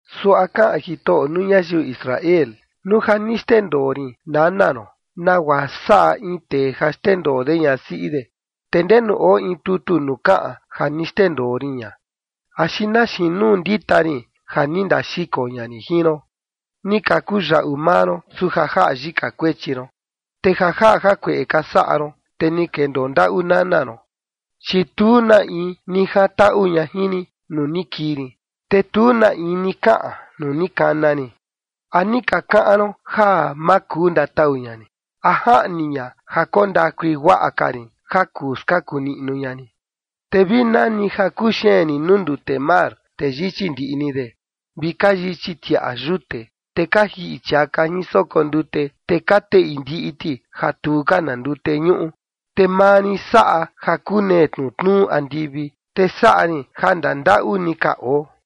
Suaꞌa kaꞌan Jitoꞌo nuu ñayiu Israel: “Nuu ja ni xndendoo rin nana ron, nagua saꞌa in tee ja xndendoo de ñasiꞌi de, ¿te ndenu oo in tutu nuu kaꞌan ja ni xndendoo rin ña? ¿Axi na xiin nuu ndita rin ja ni ndaxiko ña rin jin ron? Ni ka kuyaꞌu maa ron, su ja jaꞌa yika kuechi ron. Te ja jaꞌa jakueꞌe ka saꞌa ron, te ni kendoo ndaꞌu nana ron. Chi tu na in ni jantaꞌu ña jin rin nuu ni kii rin, te tu na in ni kaꞌan nuu ni kana rin. ¿A ni ka kaꞌan ron ja ma kuu ndatau ña rin? ¿A jaꞌni ña ja koo ndakui guaꞌa ka rin ja kuu skaku niꞌnu ña rin? Te vi nani ja kuxeen rin nuu ndute mar, te yichi ndiꞌi ni de, vi ka yichi tiꞌa yute, te ka jiꞌi chiaka jin soko ndute, te ka teꞌi ndiꞌi ti ja tu ka na ndute ñuꞌu. Te maa rin saꞌa ja kunee tnutnuu andivi, te saꞌa rin ja ndandaꞌu ni ka oo.”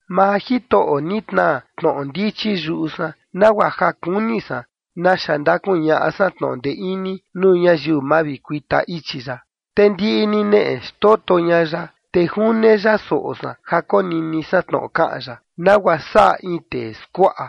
Maa Jitoꞌo ni tnaa tnoꞌo ndichi yuꞌu san, nagua ja kuni san naxa ndakuñaꞌa san tnoꞌo ndee ini nuu ñayiu mavikuita ichi ya. Te ndiꞌi ni neꞌe xtoto ña ya, te june ya soꞌo san ja konini san tnoꞌo kaꞌan ya nagua saꞌa in tee skuaꞌa.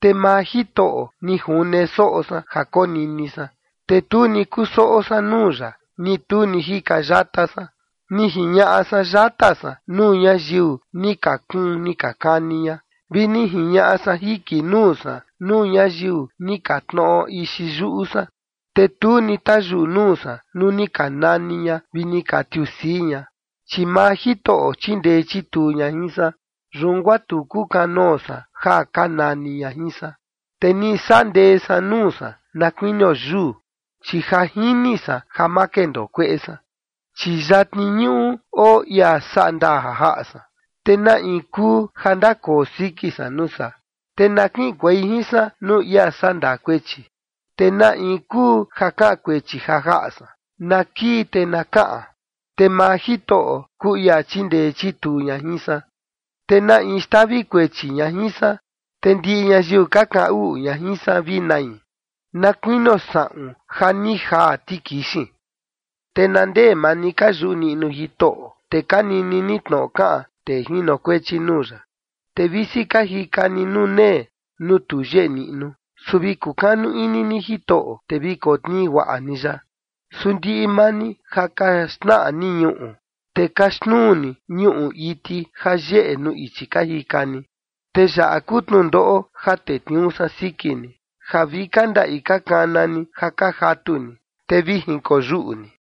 Te maa Jitoꞌo ni june soꞌo san ja konini san, te tu ni kusoꞌo san nuu ya, ni tu ni jika yata san. Ni jiñaꞌa san yata san nuu ñayiu ni ka kuun ni ka kani ña, vi ni jiñaꞌa san jiki nuu san nuu ñayiu ni ka tnoꞌo ixi yuꞌu san, te tu ni tayuꞌu nuu san nuu ni ka nani ña vi ni ka tiusii ña. Chi maa Jitoꞌo chindee chituu ña jin san, yun guaa tu kukanoo san ja ka nani ña jin san. Te ni saꞌa ndee san nuu san na kuinio yuu, chi ja jini san ja ma kendoo kueꞌe san. Chi yatni ñuꞌu oo ia saꞌa ndaa ja jaꞌa san, ¿te na in kuu ja ndakoo siki san nuu saa? Te na kiꞌinkuei jin san nuu ia sandaa kuechi, ¿te na in kuu ja kaꞌan kuechi ja jaꞌa san? Na kii te na kaꞌan. Te maa Jitoꞌo kuu ia chindee chituu ña jin san, ¿te na in xtavi kuechi ña jin san? Te ndiꞌi ñayiu ka kaꞌan uꞌu ña jin san vi nai, na kuinio saꞌun ja ni jaa tikixin. Te na ndee maa ni ka yuꞌu niꞌnu Jitoꞌo, te ka nini ni tnoꞌo kaꞌan tee jinokuechi nuu ya. Te visi ka jika ni nunee nuu tu yeꞌe niꞌnu, su vi kukanu ini ni Jitoꞌo, te vi kotnii guaꞌa ni ya. Su ndiꞌi maa ni ja ka xnaꞌa ni ñuꞌu, te ka xnuu ni ñuꞌu iti ja yeꞌe nuu ichi ka jika ni. Te yaꞌa kuu tnundoꞌo ja tetniuu san siki ni, ja vi ka ndaꞌi ka kana ni ja ka jatu ni, te vi jinkoyuꞌu ni.